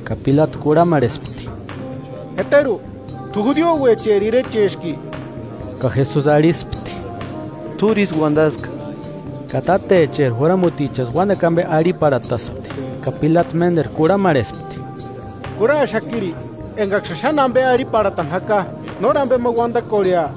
Ka Pilatu kurhamarhespti: –¿Jeteru t'u judiouecheri irecheski? Ka Jesusi arhispti: –T'úri ísï uandaska. Ka tátecheri juramutichaksï uánekua ambe arhiparhataspti, Ka Pilatu ménderu kurhamarhespti: –¿Kurhaxakiri engaksïni xáni ambe arhinharhiparhatani jaka? ¿Nóri ambema uandakorhea?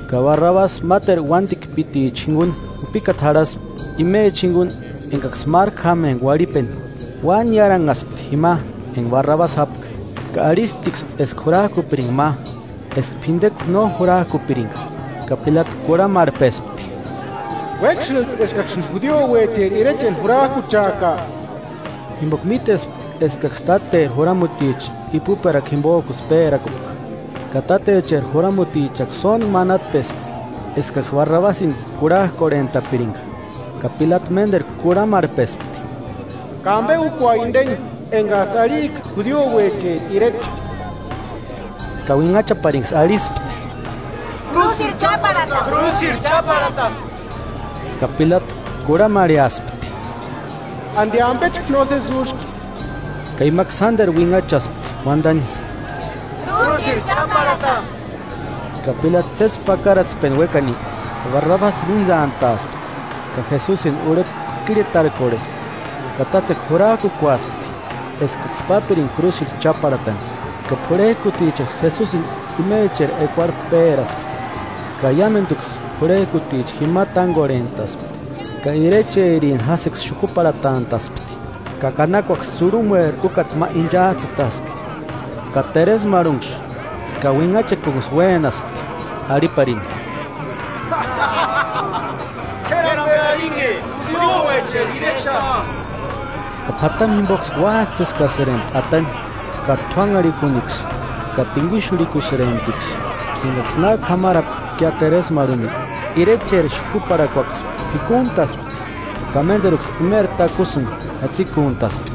Ka Barrabasi máteru uándikpiticha jinguni jupikata jarhaspti, imecha jinguni engaksï márku jámempka uarhipeni. Uáni niáranhaspti jima enga Barrabasi jápka ka arhisptiksï eska jurajkupiringa ma, eska p'indekuani no jurajkupiringa. Ka Pilatu kurhamarhpespti: –¿Uéksïntsï eskaksïni judiouecheri irechani jurajkucheaka? Jimboka mítespka eskaksï táteri juramuticha ipuperakua jimbojkusï pérakupka. Ka tátecheri juramutichaksï sóntku manatpespti eskaksï Barrabasini kurhajkorhentapiringa. Ka Pilatu ménderu kurhamarhpespti: –¿Ka ambe úkua indeni, engajtsï arhijka judiouecheri irecha? Ka uinhachapariniksï arhispti: –¡Krúsirhu cháparhata! ¡Krúsirhu cháparhata! Ka Pilatu kurhamarheaspti: –¿Andi ambechka nósesi úski? Ka imaksï sánderu uinhachaspti uandani: –¡Krúsirhu cháparhata! Arhani. Ka Pilatu sési pakaratspeni uékani, Barrabasini intsantaaspti, ka Jesusini urheta k'uikirhetarkorhespti, ka tátsekua jurajkukuaspti eskaksï pápiringia krúsirhu cháparhatani. Ka p'urhejkutichaksï Jesusini imecheri ekuarhu péraspti, ka iámenduksï p'urhejkuticha jima tángorhentaspti. Ka irecherini jásïksï xukuparhatantaspti, ka kanakuaksï tsurhumueri úkata ma inchajtsïtaspti. Ka teresmarhunksï ka uinhachakunksï uénaspti, arhiparini: –¡K'éri ambe arhinhe judiouecheri irecha! Ka p'atamu jimboksï uájtsïskasïrempti atani, ka t'uánharikuniksï ka tinguixurhikusïremptiksï. Engaksï na k'ámarapkia teresmarhuni, irecheri xukuparhakuaksï p'ikuntaspti, ka ménderuksï imeri takusïni jatsikuntaspti,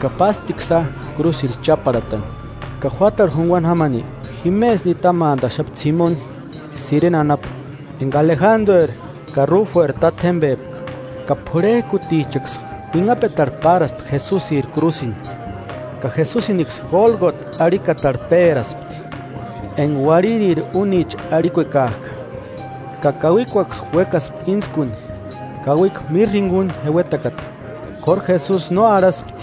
ka pásptiksïa krúsirhu cháparhatani. Ka juátarhu junguani jámani jimesï nitamantaxapti Simoni, Sirene anapu, enga Alejandrueri ka Rúfueri tátjembepka, ka p'urhejkutichaksï uinhapetarhu páraspti Jesusiri krúsini. Ka Jesusiniksï Gólgota arhikatarhu péraspti (enga: “Uarhiriri únicha” arhikuekajka). Ka kauikuaksï uékaspti íntskuni, kauikua mirra jinguni jeuetakata, k'óru Jesusi no arhaspti.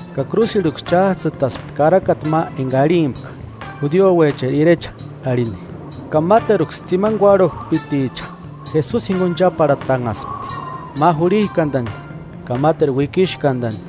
Ka krúsirhuksï chájtsïtaspti karakata ma enga arhimpka: “Judiouecheri irecha” arhini. Ka máteruksï tsimani kuárhukujpiticha Jesusi jinguni cháparhatanhaspti, ma jurhijkandani ka máteru uikixkandani.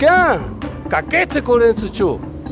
¡Kuájpekorhechkia, ka kétsekorhentsïchu!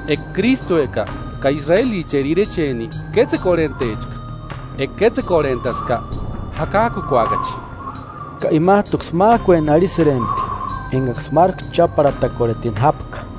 ¡Eka Krístueka, ka israelicheri irecheni, kétsekorhentechka, eka kétsekorhentaska, jakajkukuakachi! Ka imajtuksï májkueni arhisïrempti engaksï márku cháparhatakorhetini jápka.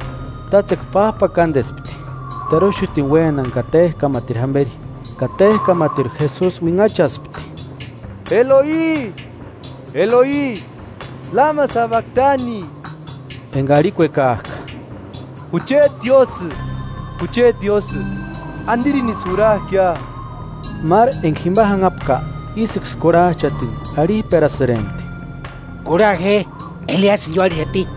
Tátsekua pájpakandespti, teruxutini uénani ka téjkamatiru jamberi. Ka téjkamatiru Jesusi uinhachaspti: “Eloi, Eloi, ¿Lama sabaktani?” (Enga arhikuekajka: “Jucheti Diósï, jucheti Diósï, ¿Andirinisï jurajkia?”) Máru enga jima janhapka, ísïksï kurhajchatini, arhijperasïrempti: –Kurha je, Eliasïni ióarhixati.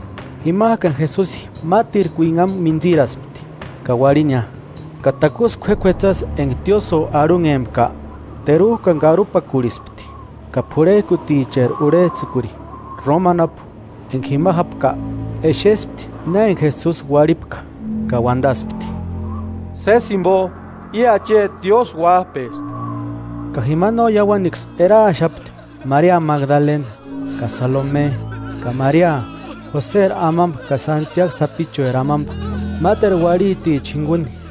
Jimajkani Jesusi mátirku uinhamu mintsiraspti, ka uarhinia. Ka takusï k'uék'uetsasï enga tiósïo arhunhempka, terujkani karupakurhispti. Ka p'urhejkuticheri urhejtsïkuri, Roma anapu, enga jima jápka, exespti na enga Jesusi uarhipka, ka uandaspti: –Sési jimbo, i acheti Diósï Uájpespti. Ka jima no iauanksï eraaxapti Maria Magdalena Magdala anapu., ka Salome, ka Maria, Joseri amamba ka Santiagu sapichueri amamba, máteru uarhiticha jinguni,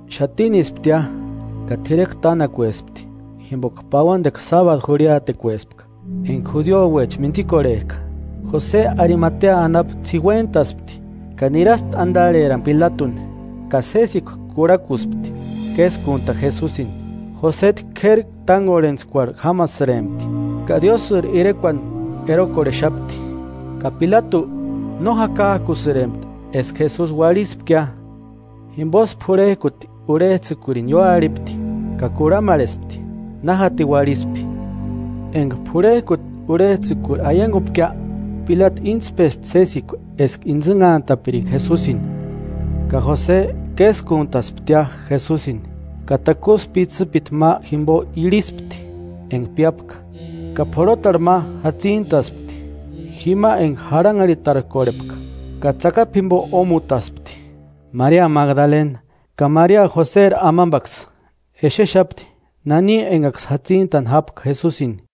Xatinisptia ka t'irekua tánakuespti jimboka pauandekua sábadu jurhiatekuespka, enga judiouecha mintsikorhejka, Jose Arimatea anapu ts'iuentaspti ka niraspti andarherani Pilatuni ka sésikua kurhakuspti késkuntani Jesusini. Josejtu k'éri tángorhentskuarhu jámasïrempti, ka Diósïri irekuani erokorhexapti. Ka Pilatu, no jakajkusïrempti eska Jesusi uarhispkia, jimbosï p'urhejkuti urhejtsïkurini ióarhipti ka kurhamarhespti, na jatini uarhispi. Enga p'urhejkuti urhejtsïkuri aiangupkia, Pilatu íntspespti sésikua eska intsïnhantapiringa Jesusini. Ka Jose késkuntasptia Jesusini, ka takusï pitsïpiti ma jimbo irhispti, enga piápka, ka p'orhotarhu ma jatsintaspti, jima enga jarhanharhitarkorhepka, ka tsakapu jimbo ómutaspti. Maria Magdalena, ka Maria Joseri amambaksï, exexapti nani engaksï jatsintani jápka Jesusini.